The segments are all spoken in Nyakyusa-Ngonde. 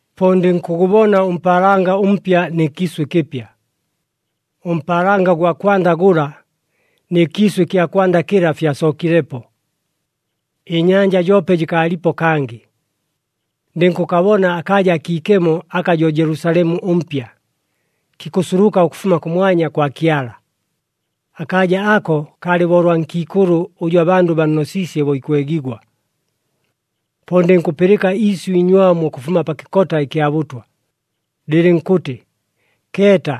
Po ndɨnkʉgʉbona ʉmpaalanga ʉmpya nɨ kiisʉ ɨkɨpya. Ʉmpaalanga ʉgwa kwanda gʉla, nɨ kiisʉ ɨkya kwanda kɨla fyasookilepo. Ɨnyanja joope jɨkaalipo kangɨ. Ndɨnkʉkabona akaaja akiikemo aka jo Jelusalemu ʉMpya, kikʉsuluka ʉkʉfuma kʉmwanya kwa Kyala. Akaaja ako kaalɨ bo ʉlwa nkiikʉlʉ ʉjʉ abandʉ bannosiisye bo ikwegigwa. Po ndɨnkʉpɨlɨka iisyʉ iinywamu ʉkʉfuma pa kɨkota ɨkya bʉtwa, lɨlɨnkʉtɨ, “Keeta!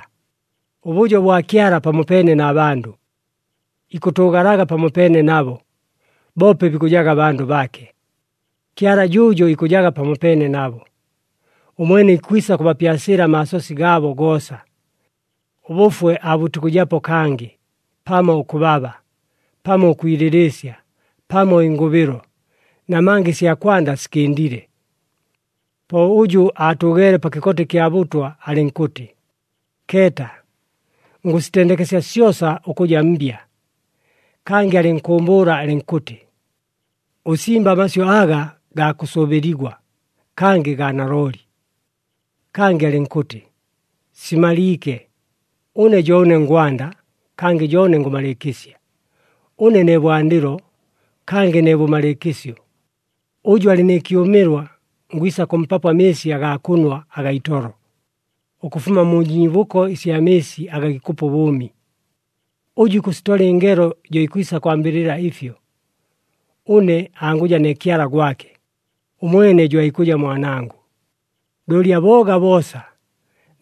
Ʉbʉjo bwa Kyala pamopeene na bandʉ. Ikʉtʉʉgalaga pamopeene nabo, boope bikʉjaga bandʉ baake. Kyala jʉʉjo ikʉjaga pamopeene nabo. Ʉmwene ikwisa kʉbapyasɨɨla amaasosi gaabo goosa. Ʉbʉfwe aabʉtikʉjapo kangɨ, pamo ʉkʉbaba, pamo ʉkwilɨlɨɨsya, pamo ɨngʉbɨlo, namanga ɨsya kwanda sikɨndile!” Po ʉjʉ aatʉʉgeele pa kɨkota ɨkya bʉtwa alɨnkʉtɨ, “Keeta! Ngʉsitendekesya syosa ʉkʉja mbya.” Kangɨ alɨnkʉʉmbʉʉla alɨnkʉtɨ, “Ʉsimbe amasyʉ aga gaa kʉsʉʉbɨligwa, kangɨ gaa nalooli!” Kangɨ alɨnkʉtɨ, “Simaliike! Ʉne jo ʉne ngwanda, kangɨ jo ʉne ngʉmalɨɨkɨsya. Ʉne ne bwandɨlo, kangɨ ne bʉmalɨɨkɨsyo. Ʉjʉ alɨ nɨ kyʉmɨlwa, ngwisa kʉmpapo amɨɨsi agaa kʉnwa agaa itolo, ʉkʉfuma mu nyiibʉko ɨsya mɨɨsi aga gikʉpa ʉbʉʉmi. Ʉjʉ ikʉsitola ɨngelo jo ikwisa kwambɨlɨla ɨfyo. Ʉne angʉja ne Kyala gwake, ʉmwene jo aikʉja Mwanangʉ. Looli abooga boosa,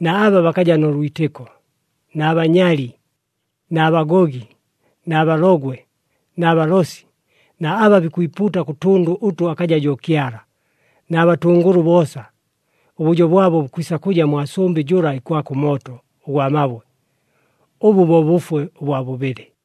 na aba bakaja nʉ lwitɨko, na banyali, na bagogi, na balogwe, na balosi, na aba bikwipuuta kʉ tʉndʉ ʉtʉ akaja jo Kyala, na batʉngʉlʉ boosa, ʉbʉjo bwabo bukwisa kʉja mwa sʉmbɨ jʉla ikwaka ʉmooto ʉgwa mabwe. Ʉbʉ bo bʉfwe ʉbwa bʉbɨlɨ.”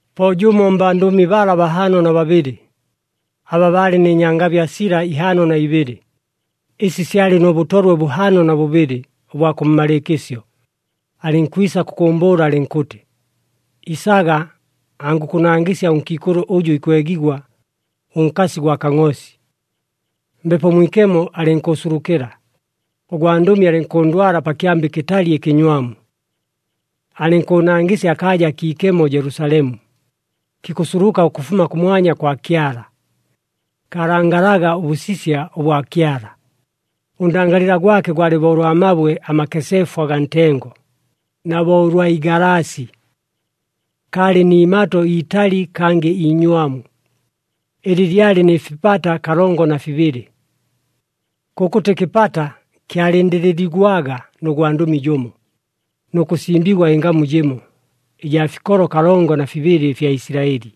Po jʉmo mbandʉmi bala bahaano na babɨlɨ, aba baalɨ nɨ nyangabya sila ihaano na ibɨlɨ, ɨsi syalɨ nʉ bʉtolwe bʉhaano na bʉbɨlɨ ʉbwa kʉmmalɨɨkɨsyo, alɨnkwisa kʉkʉʉmbʉʉla alɨnkʉtɨ, “Isaga angʉkʉnangɨsya ʉnkiikʉlʉ ʉjʉ ikwegigwa, ʉnkasi gwa Kangʼoosi!” Mbepo Mwikemo alɨnkʉʉsulukɨla, ʉgwandʉmi alɨnkʉndwala pa kyamba ɨkɨtali ɨkɨnywamu. Alɨnkʉʉnangɨsya akaaja akiikemo Jelusalemu, kikʉsuluka ʉkʉfuma kʉmwanya kwa Kyala. Kaalangalaga ʉbʉsisya ʉbwa Kyala. Ʉndangalɨla gwake gwalɨ bo ʉlwa mabwe amakeseefu agaa ntengo, na bo ʉlwa igalaasi. Kaalɨ ni imato iitali kangɨ iinywamu, ɨlɨ lyalɨ nɨ fipata kalongo na fibɨlɨ. Kʉkʉtɨ kɨpata kyalɨndɨlɨligwaga nʉ gwandʉmi jʉmo, nʉ kʉsimbigwa ɨngamu jɨmo, ɨjaa fikolo kalongo na fibɨlɨ ɨfya Isilaɨli.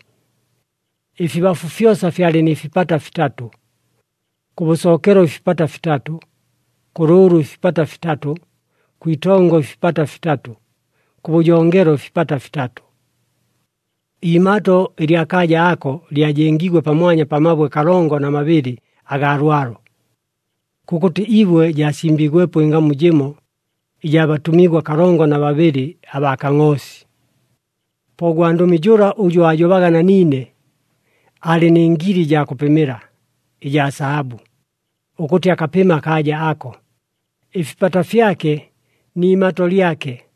Ɨfibafu fyosa fyalɨ nɨ fipata fitatʉ. Kʉbʉsookelo ɨfipata fitatʉ, kʉlʉʉlʉ ɨfipata fitatʉ, kwitongo ɨfipata fitatʉ, kʉbʉjongelo ɨfipata fitatʉ. Iimato ɨlya kaaja ako, lyajengiigwe pamwanya pa mabwe kalongo na mabɨlɨ agaa lwalo. Kʉkʉtɨ ibwe jaasimbiigwepo ɨngamu jɨmo, ɨjaa batʉmigwa kalongo na babɨlɨ abaa Kangʼoosi. Po ʉgwandʉmi jʉla ʉjʉ aajobaga na niine, aalɨ nɨ ngili ɨjaa kʉpɨmɨla ɨjaa sahabʉ, ʉkʉtɨ akapɨme akaaja ako, ɨfipata fyake ni imato lyake.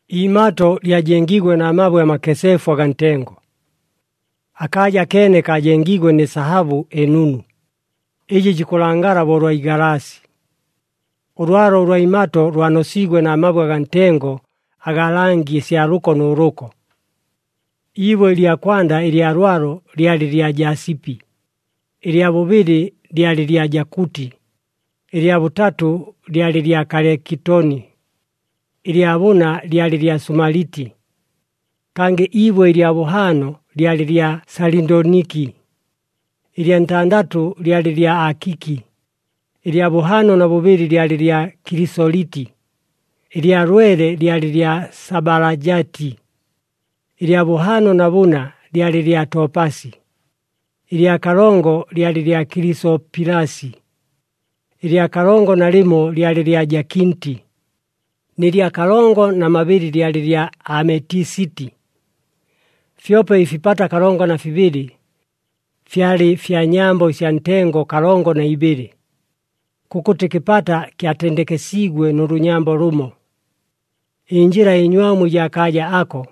Iimato lyajengiigwe na mabwe amakeseefu agaa ntengo. Akaaja akeene kaajengiigwe nɨ sahabʉ ɨnunu, ɨjɨ jikʉlangala bo ʉlwa igalaasi. Ʉlwalo ʉlwa imato lwanosiigwe na mabwe agaa ntengo agaa langi ɨsya lʉko nʉ lʉko. Iibwe ɨlya kwanda ɨlya lwalo lyalɨ lya jasipi, ɨlya bʉbɨlɨ lyalɨ lya jakʉtɨ, ɨlya bʉtatʉ lyalɨ lya kaliketoni, ɨlya bʉna lyalɨ lya sumaliti. Kangɨ iibwe ɨlya bʉhaano lyalɨ lya salindoniki, ɨlya ntandatʉ lyalɨ lya akiki, ɨlya bʉhaano na bʉbɨlɨ lyalɨ lya kilisoliti, ɨlya lwele lyalɨ lya sabalajati, ɨlya bʉhaano na bʉna lyalɨ lya topasi, ɨlya kalongo lyalɨ lya kilisopilasi, ɨlya kalongo na lɨmo lyalɨ lya jakinti, nɨ lya kalongo na mabɨlɨ lyalɨ lya ametisiti. Fyope ɨfipata kalongo na fibɨlɨ, fyalɨ fya nyambo ɨsya ntengo kalongo na ibɨlɨ. Kʉkʉtɨ kɨpata kyatendekesiigwe nʉ lʉnyambo lʉmo. Ɨnjɨla ɨnywamu ɨjaa kaaja ako,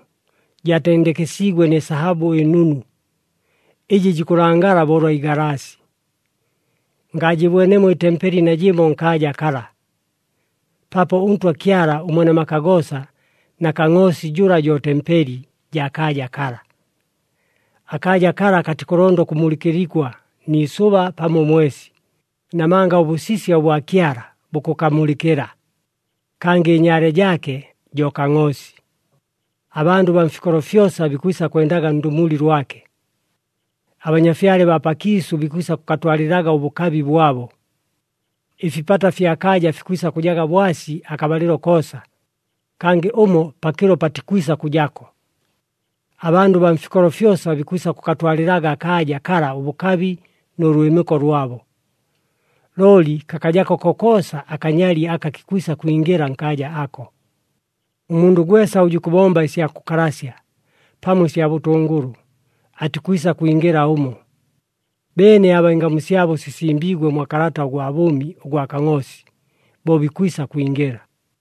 jaatendekesiigwe nɨ sahabʉ ɨnunu, ɨjɨ jikʉlangala bo ʉlwa igalaasi. Ngaajɨbwenemo ɨtempeli najɨmo nkaaja kala, paapo ʉNtwa Kyala ʉMwene maka goosa na Kangʼoosi jʉla jo tempeli jaa kaaja kala. Akaaja kala katikʉlonda ʉkʉmulɨkɨligwa ni isʉba pamo ʉmwesi, namanga ʉbʉsisya ʉbwa Kyala bukʉkamulɨkɨla, kangɨ ɨnyaale jaake jo Kangʼoosi. Abandʉ baa mfikolo fyosa bikwisa kwendaga ndʉmuli lwake. Abanyafyale baa pakiisʉ bikwisa kʉkatwalɨlaga ʉbʉkabi bwabo. Ɨfipata ɨfya kaaja fikwisa kʉjaga bwasi akabalɨlo koosa, kangɨ ʉmo pakɨlo patikwisa kʉjako. Abandʉ baa mfikolo fyosa bikwisa kʉkatwalɨlaga akaaja kala ʉbʉkabi nʉ lwɨmɨko lwabo. Looli kakajako kokoosa akanyali aka kikwisa kwingɨla nkaaja ako. Ʉmundʉ gwesa ʉjʉ ikʉbomba ɨsya kʉkalasya, pamo ɨsya bʉtʉngʉlʉ, atikwisa kwingɨla ʉmo. Beene aba ɨngamu syabo sisimbiigwe mwa kalata ʉgwa bʉʉmi ʉgwa Kangʼoosi, bo bikwisa kwingɨla.